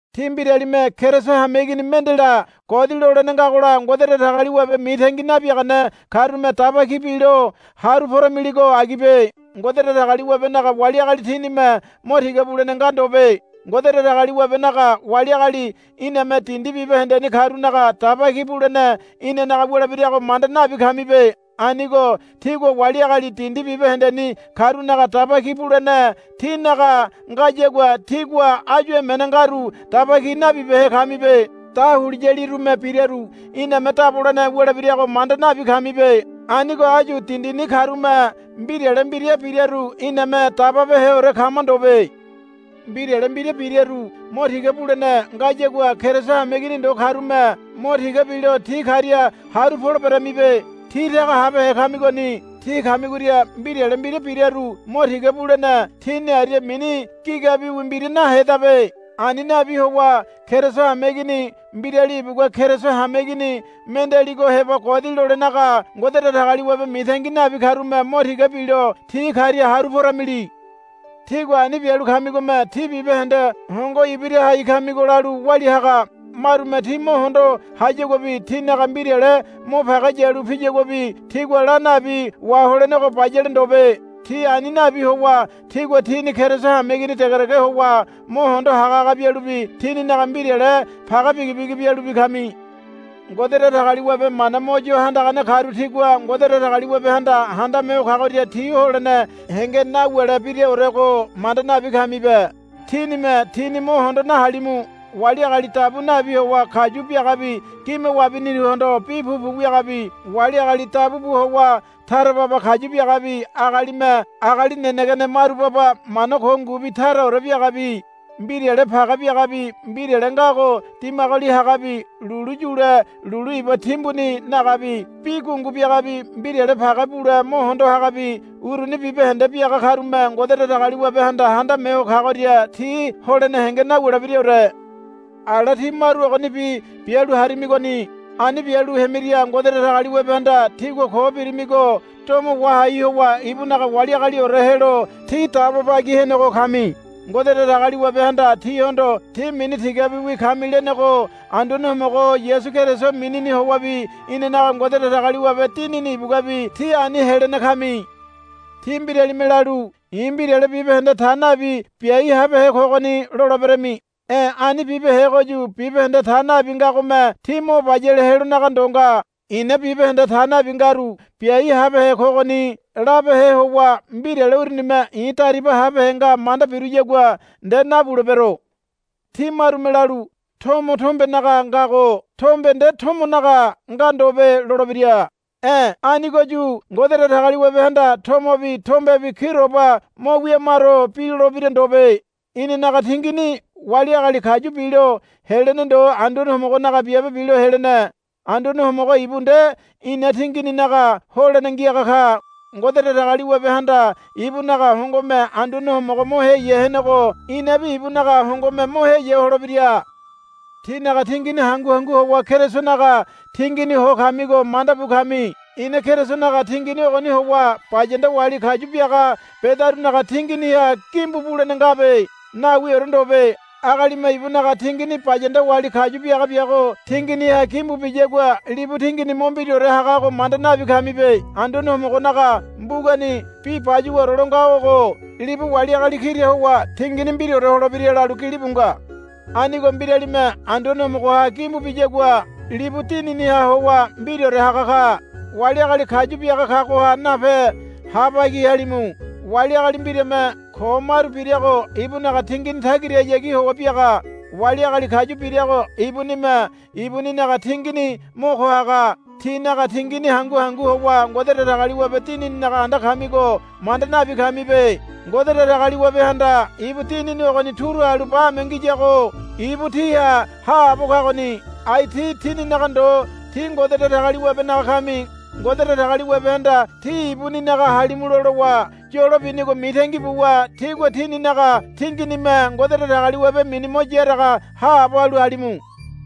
Tí mbiralime Keriso hameigini mendela godi lolene ngagola Ngode Datagaliwabe mitangi nabiagane karume daba ki bilo haru poramiligo agibe. Ngode Datagaliwabenaga wali agali tínime mo tiga bulene nga ndobe. Ngode Datagaliwabenaga wali agali iname dindi bibahendeni karunaga daba ki bulene inanaga wulebirago manda nabi kamibe. Anigo tígua wali agali dindi bibahendeni karunaga daba ki bulene tínaga ngayagua tígua áyu emene ngaru daba ki nabibehe kamibe. Dahuliyalirume biraru iname dabolene wulebirago manda nabi kamibe. Anigo áyu dindini karume mbirale mbira biraru iname dababeheore kama ndobe. Mbirale mbira biraru mo tiga bulene ngayagua Keriso hameigini ndo karume mo tiga bilo ti karia haru poleberamibe. Tí taga habehe kamigoni. Tí kamigoria mbirale mbira biraru mo tiga bulene tíni aria mini gigabiwi mbira nahedabe. Ani nabi howa Keriso hameigini mbirali ibugua Keriso hameigini mendealigo heba godi lolenaga Ngode Datagaliwabe mitangi nabi karume mo tiga bilo ti karia haru poramili. Tígua ani bialu kamigome tí bibahende hongo ibira hai kamigo lalu walia haga. Marume tí mo hondo hayaguabi tínaga mbirale mo page yalu piyaguabi tígua la nabi waholenego bayale ndobe. Tí ani nabi howa tígua tíni Keriso hameigini degedege howa mo hondo hagahaga bialubi tíninaga mbirale page bigibigi bialubi kami. Ngode Datagaliwabe mana mo yo handagane karu tigua Ngode Datagaliwabehanda Handame Ho Kagoria ti holene henge nawulebiraorego manda nabi kamibe. Tínime tíni mo hondo nahalimu. Wali agali dabu nabi howa kayu biagabi gime wabiniruhondo bi pupu wiagabi wali agali dabu bu howa tara baba kayu biagabi agalime agali nenegene maru baba mana ko ngubi taraore biagabi mbirale page biagabi mbirale ngago dimagoli hagabi lulu yule lulu iba timbuni nagabi bi gungu biagabi mbirale page bule mo hondo hagabi uruni bibahende biaga karume Ngode Datagaliwabehanda Handame Ho Kagoria ti holene henge nawulebiraore. Ala tí maru ogonibi bialu harimigoni. Ani bialu hemiria Ngode Datagaliwabehanda tígua ko birimigo domo wahai howa ibunaga wali agaliore helo tí dabo bagi henego kami. Ngode Datagaliwabehanda tíhondo, Tí mini tigabiwi kami, lenego Anduane Homogo Yasu Keriso minini howabi inanaga Ngode Datagaliwabe Dinini ibuguabi tí ani helene kami. Tí mbiralime lalu, I̱ mbirale bibahende ta nabi biai habehe kogoni, loleberami. E̱ ani bibehegoyu bibahende ta nabi ngagome tí mo bayale helonaga ndo nga. I̱na bibahende ta nabi ngaru biai habehe kogoni labehe howa mbirale urunime i̱ dariba habehe nga manda biruyagua nde nabulebero. Tí marume lalu, Tomo tombenaga ngago tombe nde tomonaga nga ndobe lolebira. E̱ anigoyu Ngode Datagaliwabehanda tomobi tombebi kiroba mo wiamaro bilolebira ndobe. Inanaga tingini wali agali kayu bilo helene ndo Anduane Homogonaga biabe bilo helene. Anduane Homogo ibu nde ina tingininaga holene ngiaga ka. Ngode Datagaliwabehanda ibunaga hongome Anduane Homogo mo heya henego inabi ibunaga hongome mo heya holebira. Tínaga tingini hangu hangu howa Kerisonaga tingini ho kamigo manda bu kami. I̱na Kerisonaga tingini ogoni howa bayanda wali kayu biaga bedarunaga tinginiha gimbu bulene ngabe. Nawiore ndobe. Agalime ibunaga tingini bayanda wali kayu biaga biago tinginiha gimbu biyagua libu tingini mo mbiraore hagago manda nabi kamibe. Anduane Homogonaga mbugani bi bayuwaore lo ngago ogo, Libu wali agali kira howa tingini mbiraore holebira, lalu gilibu nga. Anigo mbiralime Anduane Homogoha gimbu biyagua libu dininiha howa mbiraore haga ka. Wali agali kayu biaga kagoha nape ha bagi halimu. Wali agali mbirame ko maru birago ibunaga tingini tagirahayagi howa biaga. Wali agali kayu birago ibunime ibuninaga tingini mo ko haga. Tínaga tingini hangu hangu howa Ngode Datagaliwabe Dinininaga anda kamigo manda nabi kamibe. Ngode Datagaliwabehanda ibu Dinini ogoni turu halu bame ngiyago ibu tíha haabo kagoni. Ai tí tíninaga ndo tí Ngode Datagaliwabenaga kami. Ngode Datagaliwabehanda tí ibuninaga halimulo lowa yolo binigo mitangi buwa tígua tíninaga tinginime Ngode Datagaliwabe mini mo yaraga haabo halu halimu.